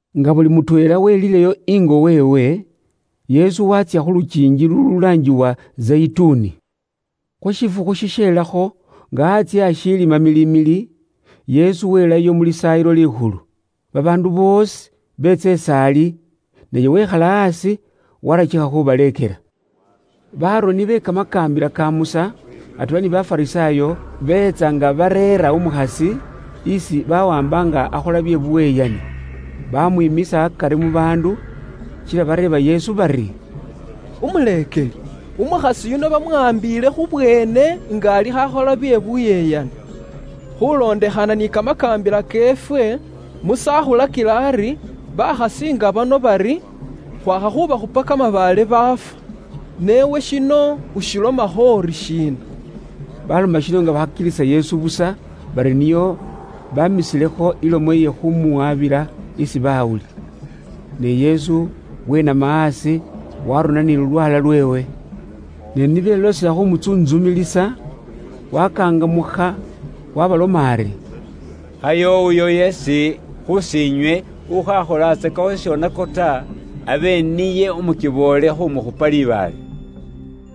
Nga buli mutweela welileyo ingo weewe, Yesu waatsya khu lukiingi lululaangibwa Zeyituni. Khu shifukhu shisheelakho nga antsye ashiili mamilimili, Yesu welayo mu Lisaayilo Likhulu. Babaandu boosi beetsa is'ali, naye wekhala aasi warakikha khu baleekela. Baaroni be Kamakaambila ka Musa atweela ni Bafarisaayo beetsa nga bareera umukhasi, isi bawaamba nga akhola bye buyeyani. Baamwiimisa akari mu baandu, kila bareeba Yesu bari, “Umuleekeli, umukhasi yuno bamuwaambiile khu bweene nga alikho akhola bye buyeyani. Khuulondekhana ni kamakaambila keefwe, Musa akhulakila ari bakhasi nga bano bari khwakha khubakhupa kamabaale baafwa. Ne iwe shino ushilomakho uri shiina?” Baaloma shino nga bakhakilisa Yesu busa, bari nio baamisilekho ilomo iye khuumuwabila isi baawuli. Ne Yesu wenama aasi waarona ni lulwaala lweewe. Ne ni beloosela khuumutsuntsumilisa, waakangamukha waabaloma ari, “Khayo uyo yeesi khus'inywe ukhaakholatsakakho shishonako ta, abe niye umukiboole khumukhupa libaale.”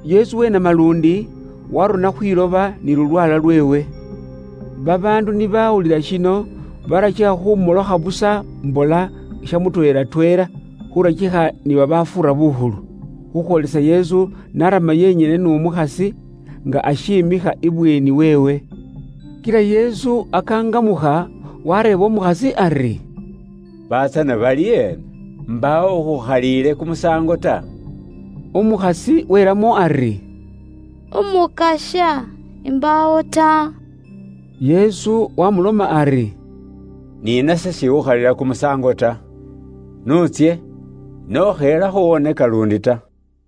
Yesu wenama luundi, waarona khwiloba ni lulwaala lweewe. Babaandu ni bawulila shino, barakikha khumolokha busa mbola sha mutweela tweela, khurakikha ni babafuura bukhulu. Khukhwoolisa Yesu n'aarama yenyene n'umukhasi nga ashimikha ibweeni weewe. Kila Yesu akaangamukha, waareeba umukhasi ari, “Batsana bali eena? Mbaawo ukhukhaliile kumusaango ta?” Umukhasi welamo ari, “Umukasya, imbaawo ta.” Yesu waamuloma ari, “Ni nase s'ikhukhalila kumusaango ta. N'utsye, ne ukheelakho wonaka luundi ta.”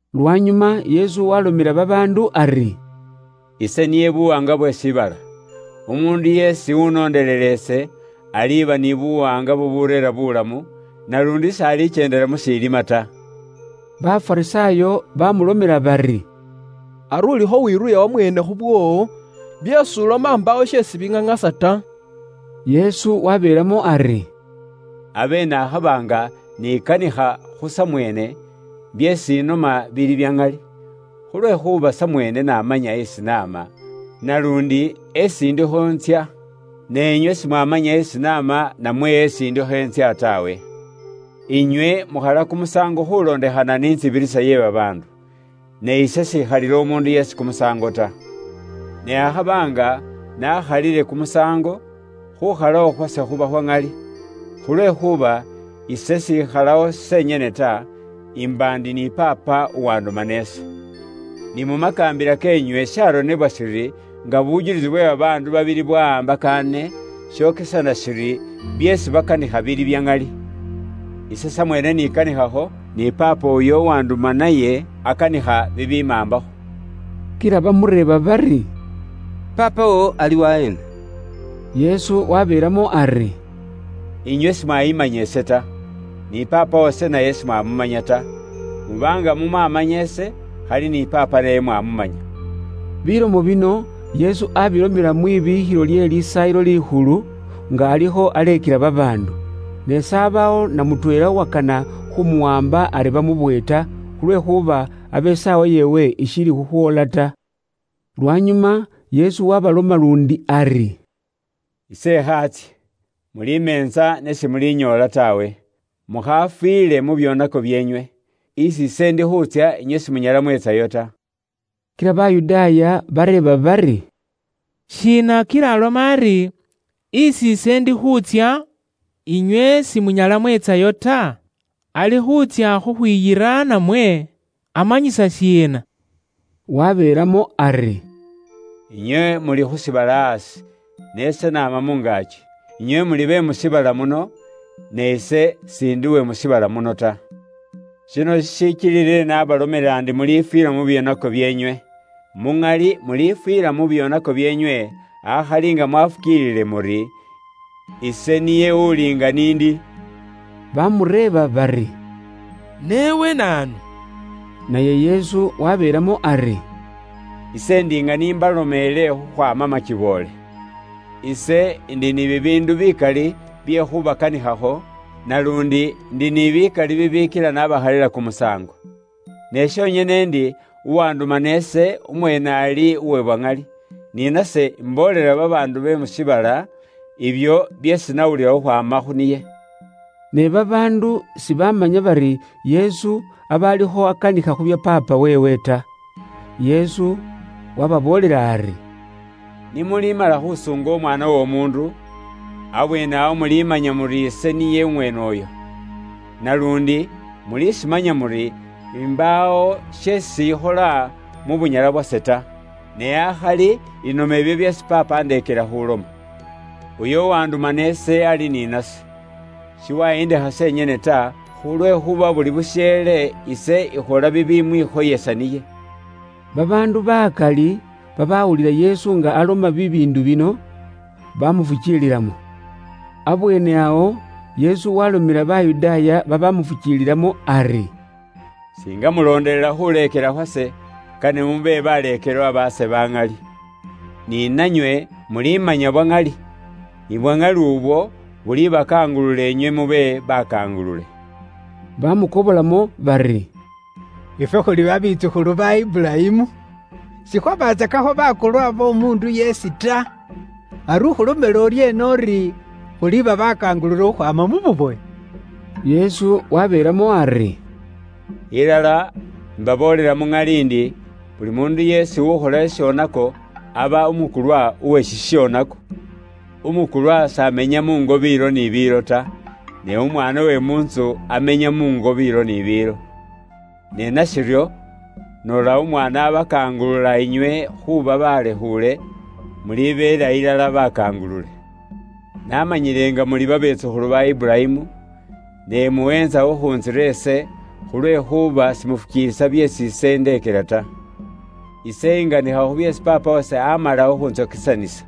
Lwanyuma Yesu waalomela babaandu ari, “Ise niye buwaanga bwe shiibala. Umuundu yeesi uwunondelela ise, aliba ni buwaanga bubureera buulamu, naluundi s'alikyendela mu shiilima ta.” Bafarisaayo bamulomela bari, “Ari ulikho wiruuya wamweene khu bwoowo. Byeesi uloma si bili bya ŋali ta.” Yesu waabeelamo ari, “Abe nakhaba nga nikanikha khu samweene, byeesi inoma bili bya ŋali. Khulwekhuuba samweene namanya esi naama, naluundi esi indikho ntsya. Ne inywe simwamanya esi naama namwe esi indikho intsya taawe. Inywe mukhala kumusaango khulondekhana ni intsibirisa iye babaandu. Ne ise s'ikhalila umuundu yeesi kumusaango ta. Ne akhaba nga nakhalile kumusaango, khukhalawo khwase khuba khwa ŋali, khulwekhuuba ise s'ikhalawo senyene ta, imba ndi ni Paapa uwandumana ise. Ni mu makaambila keenywe sharonebwa shiri nga bujulisi bwe babaandu babili bwawaambakaane, shokesana shiri byeesi bakanikha bili bya ŋali. Ise samweene nikanikhakho, ni Paapa uyo uwanduma naye akanikha bibimaambakho.” Kila bamureeba bari, “Paapa woowo ali waheena?” Yesu wabeelamo ari, “Inywe simwayiimanya ise ta. Ni Paapa wase naye simwamumanya ta. Muba nga mumwamanya ise, khali ni Paapa naye mwamumanya.” Bilomo bino Yesu abilomela ambi n'isanduukhu iye libikhilo lye Lisaayilo Likhulu, nga alikho aleekela babaandu. Ne s'abawo na mutweela uwakana khumuwaamba ari bamubowe ta, khulwekhuuba abe isaawa yeewe ishiili khukhwoola ta. Lwanyuma Yesu waabaloma luundi ari, “Ise ikhaatsye. Mulimeentsa ne simulinyoola taawe. Mukhaafiile mu byoonako byeenywe. Isi ise ndi khuutsya, inywe simunyala mweetsayo ta.” Kila Bayudaaya bereeba bari, “Shiina kila aloma ari, ‘Isi ise ndi khuutsya, inywe simunyala mwetsayo ta?’ Ali khuutsya khukhwiyira namwe, amanyisa shiina?” Wabeelamo ari, “Inywe muli khu shiibala aasi, ne ise naama mu ngaaki. Inywe muli be mu shiibala muno, ne ise s'indi uwe mu shiibala muno ta. Shino shishikilile nabalomela ndi mulifwiila mu byoonako byeenywe. Muŋali mulifwiila mu byoonako byeenywe, akhali nga mwafukiiliile muri, ‘Ise niye uli nga n'indi.’” Baamureeba bari, “Ne iwe naanu?” Naye Yesu waabeelamo ari, “Ise ndi nga ni mbalomeele khukhwaama makiboole. Ise ndi ni bibiindu bikali bye khubakanikhakho, naluundi ndi ni bikali bibikila nabakhalila kumusaango. Ne shonyene ndi uwandumana ise, umweene ali uwe bwa ŋali. Ni nase imboolela babaandu be mu shiibala ibyo byeesi nawulila khukhwaama khu niye.” Ne babaandu sibaamanya bari Yesu aba alikho akanikha khu bya Paapa weewe ta. Yesu waababoolela ari, “Ni mulimala khusuunga Umwaana w'Omuundu, abweene awo mulimanya muri ise niye umweene uyo. Naluundi mulishimanya muri imbaawo sheesi ikhola mu bunyala bwase ta. Ne akhali inoma ibyo byeesi Paapa andekeela khuloma. Uyo uwandumana ise ali ni nase. Shiwayindekha senyene ta, khulwekhuuba buli busheele ise ikhola bibimwikhoyesa niye.” Babaandu bakali babawulila Yesu nga aloma bibiindu bino, bamufukiililamo. Abweene awo Yesu waalomela Bayudaaya babamufukiililamo ari, “Singa mulondelela khuleekela khwase, ilala kane mube baleekelwa baase, ni nanywe mulimanya bwa ŋali. Ni bwa ŋali ubwo bulibakangulula inywe mube bakangulule.” Bamukobolamo bari, “Ifwe khuli babetsukhulu ba Iburayimu. Sikhwabatsakakho bakulwa b'omuundu yeesi ta. Ari ukhulomela uryeena uri khuliba baakangulule khukhwaama mu bubowe?” Yesu wabeelamo ari, “Ilala, imbaboolela muŋali ndi, buli muundu yeesi ukhola shishonako, aba umukulwa uwe shishonako. Umukulwa s'amenya muungo biilo ni biilo ta. Ne umwaana uwe mu ntsu amenya muungo biilo ni biilo. Ne nashiryo, noola umwaana abakangulula inywe khuuba balekhuule, mulibeela ilala bakangulule. Namanyile nga muli babetsukhulu ba Iburayimu, ne muweentsa khukhuntsira ise, khulwekhuuba simufukiilisa byeesi ise indeekela ta. Ise inganikha khu byeesi Paapa wase amala khukhuntsokesanisa.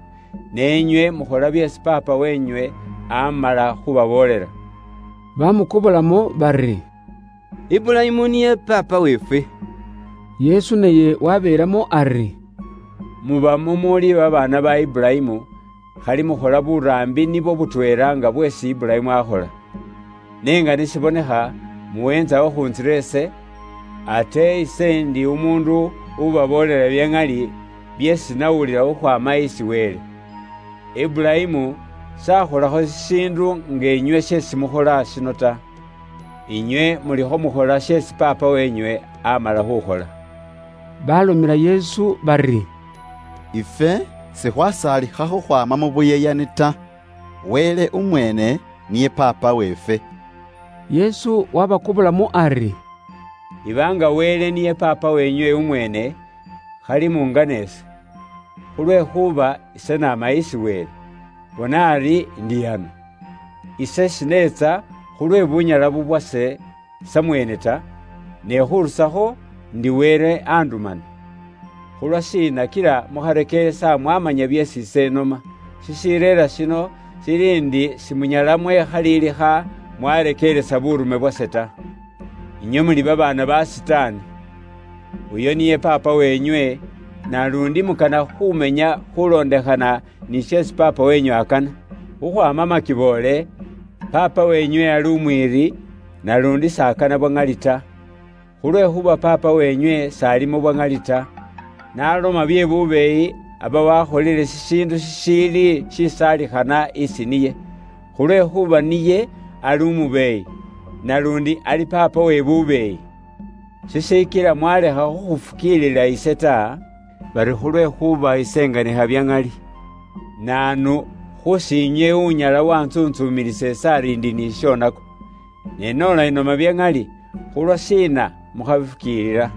Ne inywe mukhola byeesi paapa wenywe amala khubaboolela.” Bamukobolamo bari, “Iburayimu niye paapa weefwe.” Yesu naye wabeelamo ari, “Muba mumuuli babaana ba Iburayimu, khali mukhola buraambi nibwo butweela nga bweesi Iburayimu akhola. Ne nga ni shibonekha, muweentsa khukhuntsira ise, ate ise ndi umuundu ubaboolela bya ŋali byeesi nawulila khukhwaama isi Wele. Iburayimu s'akholakho shishiindu nga inywe sheesi mukhola shino ta. Inywe mulikho mukhola sheesi paapa wenywe amala khukhola.” Balomela Yesu bari, “Ifwe sikhwasaalikha khukhwaama mu buyeyani ta. Wele umweene niye Paapa weefwe.” Yesu wabakobolamo ari, “Iba nga Wele niye Paapa wenywe umweene, khali mungana ise. Khulwekhuuba ise naama isi Wele, bona ari indi ano. Ise shineetsa khulwe bunyala bubwase samweene ta, ne khurusakho ndi Wele andumana. Khulwa shiina kila mukharekeeresa mwamanya byeesi ise inoma? Shishireera shino shiri ndi simunyala mwekhalilikha mwarekeeresa buurume bwase ta. Inywe muli babaana ba Sitaani! Uyo niye paapa wenywe, naluundi mukana khuumenya khulondekhana ni sheesi paapa wenywe akana. Khukhwaama makiboole, paapa wenywe ali umwiiri, naluundi s'akana bwa ŋali ta. Khulwekhuuba paapa wenywe s'alimo bwa ŋali ta. N'aloma bye bubeeyi aba wakholile shishiindu shishiili shiisaalikhana isi niye. Khulwekhuuba niye ali umubeeyi, naluundi ali paapawe uwe bubeeyi. Shishikila mwalekha khukhufukiilila ise, bari khulwekhuuba ise inganikha bya ŋali. Naanu khus'inywe unyala wantsuntsumilisa ise ari indi ni shishonako? Ne noola inoma bya ŋali, khulwashiina mukhabifukiilila?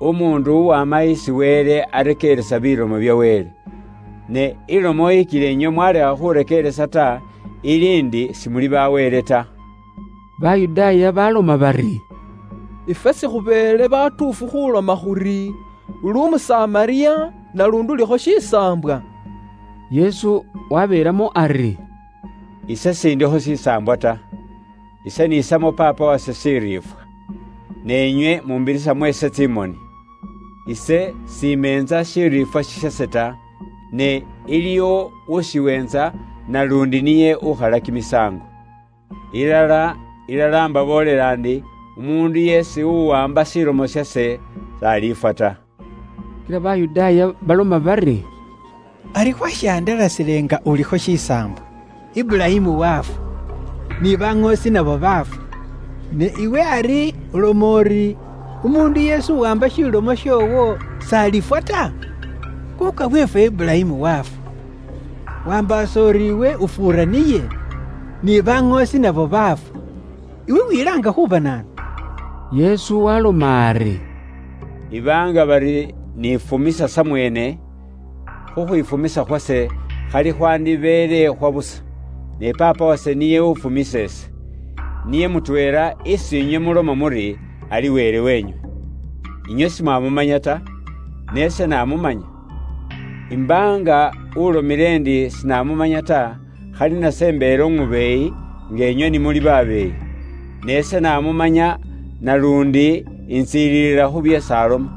Umuundu uwama isi Wele arekeeresa bilomo bya Wele. Ne ilomo ikila inywe mwalekha khurekeeresa ta, ili ndi simuli ba Wele ta.” Bayudaaya baloma bari, “Ifwe sikhubeele batuufu khuloma khuri uli Umusamariya, naluundi ulikho shisaambwa?” Yesu wabeelamo ari, “Ise s'indikho shisaambwa ta. Ise niisamo Paapa wase shiriifwa. Ne inywe muumbirisamo ise tsimoni. Ise s'imeentsa shiriifwa shishase ta. Ne iliwo ushiweentsa, naluundi niye ukhala kimisaango. Ilala, ilala imbaboolela ndi, umuundu yeesi uwaamba shilomo shase, s'alifwa ta.” Kila Bayudaaya baloma bari, “Ari khwashihandalasile nga ulikho shisaambwa! Iburayimu wafwa, ni baŋoosi nabo baafwa, ne iwe ari uloma uri umuundu yeesi uwaamba shilomo shoowo s'alifwa ta? Kuuka weefwe Iburayimu wafwa. Wambaasa uri iwe umufuura niye? Ni baŋoosi nabo baafwa. Iwe wilaanga khuuba naanu?” Yesu waaloma ari, “Iba nga bari nifumisa samweene, khukhwifumisa khwase khali khwandibeele khwa busa; ne Paapa wase niye uwufumisa ise. Niye mutweela isi inywe muloma muri ali Wele weenywe. Inywe simwamumanya ta, ne ise namumanya. Imba nga ulomile ndi sinamumanya ta, khali nase imbeele umubeeyi, nga inywe ni muli babeeyi. Ne ise namumanya naluundi intsiililila khu byeesi aloma.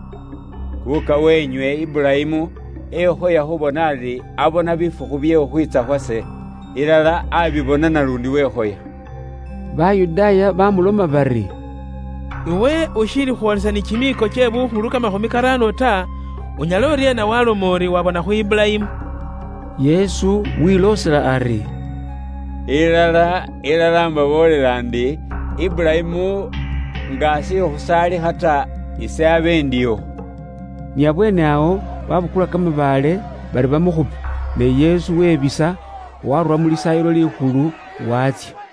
Kuuka wenywe Iburayimu ekhoya khubona ari abona bifukhu bye khukhwiitsa khwase. Ilala abibona, naluundi wekhoya.” Bayudaaya bamuloma bari, “Iwe ushiili khwoolesa ni kimiiko kye bukhulu kamakhumi karaano ta, unyala uryeena waloma uri waabona khu Iburayimu?” Yesu wiloosela ari, “Ilala, ilala imbaboolela ndi, Iburayimu nga ashiili khusaalikha ta, ise nga indiwo.” Ni abweene awo babukula kamabaale bari bamukhupe, ne Yesu webisa, waarura mu Lisaayilo Likhulu, waatsya.